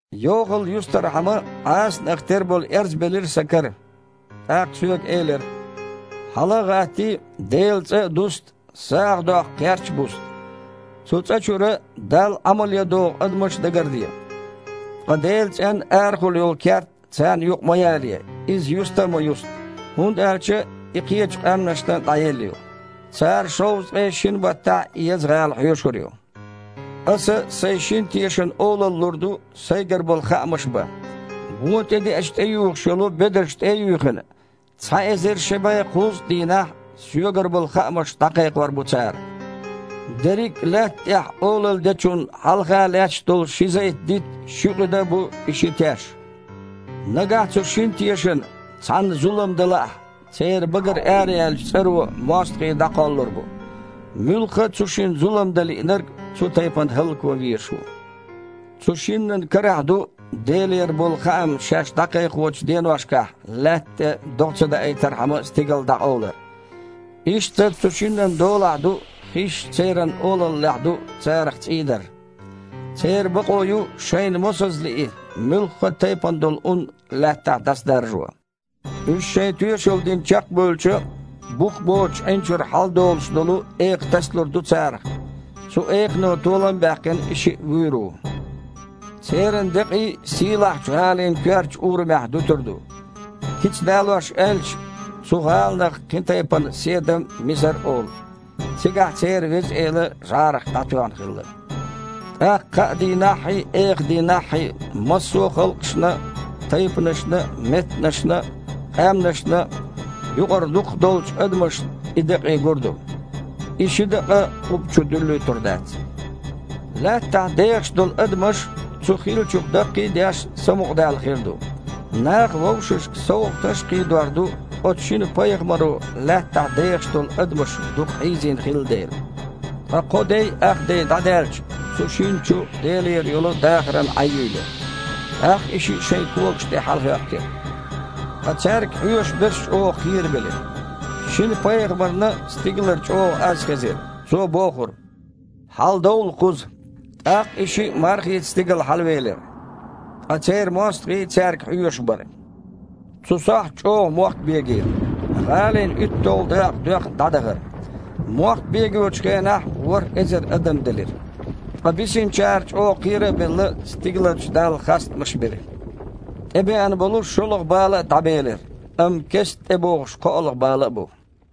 Йохалла юстархьама Іасанах тера болу эрз белира сан кара. ТІаккха соьга элира: «Хьала а гІаттий, Делан цІа а дуста, сагІа доккху кхерч а буста, цу цІа чуьра Далла Іамал ян догІу адамаш а дагарде. Ткъа Делан цІенна арахула йолу керт царна юкъа ма ялае, иза юста а ма юста, хІунда аьлча и кхечу къаьмнашна дІаелла ю. Цара шовзткъе шина баттахь и еза гІала хьоьшур ю. Аса Сайн шина тешана олалла лур ду Сайгара болу хаамаш бан. Вон тІедеача тІеюхуш йолу бедарш тІе а юьйхина, цхьа эзар ши бІе кхузткъа дийнахь Соьгара болу хаамаш дІакхайкхор бу цара». Дерриг а Лаьтта тІехь олалла Дечунна хьалха лаьтташ долу ши зайт-дитт а, ши къуьда а бу и ши теш. Нагахь цу шина тешана цхьанна зулам дан лаахь, церан багара араяьллачу цІаро мостагІий дІакхоллур бу. Муьлхха а цу шинна зулам дан лиънарг цу тайпана хІаллакван везаш ву. Цу шиннан карахь ду, Делера болу хаам шаьш дІакхайкхочу деношкахь лаьтта тІе догІа ца даийтархьама, стигал дІакъовлар. Иштта цу шиннан долахь ду хиш – церан олаллехь ду царах цІий дар. Церан бакъо ю, шайна мосазза лии, муьлхха а тайпана долу ун Лаьттахь дІасадаржо. Уьш шайн тоьшалла дина чекхбевлча, бух боцучу Іин чуьра хьаладолуш долу экха тасалур ду царах. Цу экхано, толам а баьккхина, и шиъ вуьйр ву. Церан декъий сийлахьчу гІалин коьртачу урамехь дуьтур ду. Кица далош аьлча, цу гІаланах кхин тайпана Седам а, Мисар а олу. Цигахь церан Веза Эла жІарах дІатоьхна хилла. ТІаккха кхаа дийнаххьий, эха дийнаххьий массо а халкъашна а, тайпанашна а, меттанашна а, къаьмнашна а юкъара дукхах долчу адамашна и декъий гур ду. И ши дакъа къубба чу дуьллуьйтур дац. Лаьттахь дехаш долу адамаш, цу хиллачух даккхий а деш, самукъадаьлла хир ду. Наха вовшашка совгІаташ а кхийдор ду, оцу шина пайхамаро лаьттахь дехаш долу адамаш дукха хьийзина хилла дела. Ткъа кхо дей, ах дей дІадаьлча, цу шинна чу Делера йолу дахаран Іаь юьйлира. ТІаккха и шиъ шайн когаш тІе хьалахІоьттира. Ткъа цаьрга хьоьжуш берш чІогІа кхерабелира. Шина пайхамарна стигалара чІогІа аз хезира. Цо бохура: «Хьаладовла кхуза!» ТІаккха и шиъ мархица стигала хьалавелира. Ткъа церан мостагІий цаьрга хьоьжуш бара. Цу сохьта чІогІа мохк бегийра. ГІалин уьтталгІа дакъа доьхна дІадахара. Мохк бегочу хенахь ворхІ эзар адам делира. Ткъа бисинчара, чІогІа кхера а белла, стигаларчу Далла хастамаш бира. ТІебеана болу шолгІа бала а дІабелира, амма кестта тІебогІуш кхоалгІа бала а бу.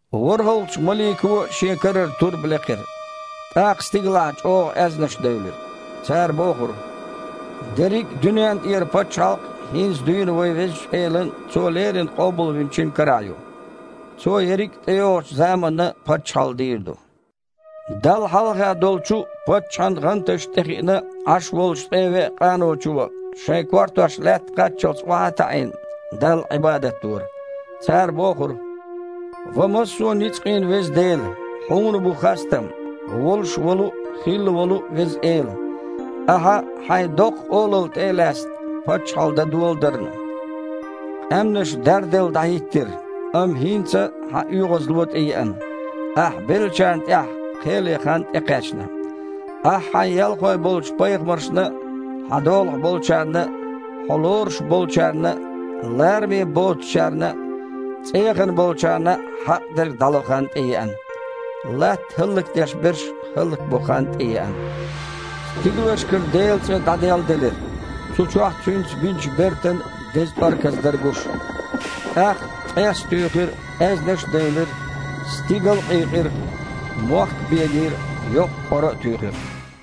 ВорхІалгІачу малико а Шен карара турба лекхира. ТІаккха стигалахь чІогІа аьзнаш девлира. Цара бохура: «Дерриг а дуьнен тІера пачхьалкх хІинца дуьйна вайн Везачу Элан а, Цо леррина Къобалвинчун а карахь ю. Цо ерриг а тІейогІучу заманна паччахьалла дийр ду». Далла хьалха долчу паччахьан гІанташна тІе хиъна Іаш волчу ткъе веа къаночо, шайн кортош лаьтта кхаччалц охьа а таІийна, Далла Іибадат дора. Цара бохура: «Ва массо а ницкъийн Веза Дела, Хьуна бу хастам, волуш волу а, хилла волу а Веза Эла, Ахьа, Хьайн доккха олалла тІе а лаьцна, паччахьалла дан доладарна. Къаьмнаш дарделла дІахІиттира, амма хІинца Хьан оьгІазло а тІееана, Ахь беллачарна тІехь кхел ен хан а тІекхаьчна. Ахьа Хьайн ялхой болчу пайхамаршна а, Хьан долахь болчарна а, Хьо лоруш болчарна а, лараме боцучарна а, цІеяхана болчарна а хьакъ дерг дІало хан а тІееана. Латта хІаллакдеш берш хІаллакбо хан а тІееана!» Стигалшкара Делан цІа дІаделладелира. Цу чохь Цуьнца бинчу бертан деза тІорказ дара гуш. ТІаккха ткъес а туьйхира, аьзнаш а девлира, стигал а къийкъира, мохк а бегийра, йоккха къора а туьйхира.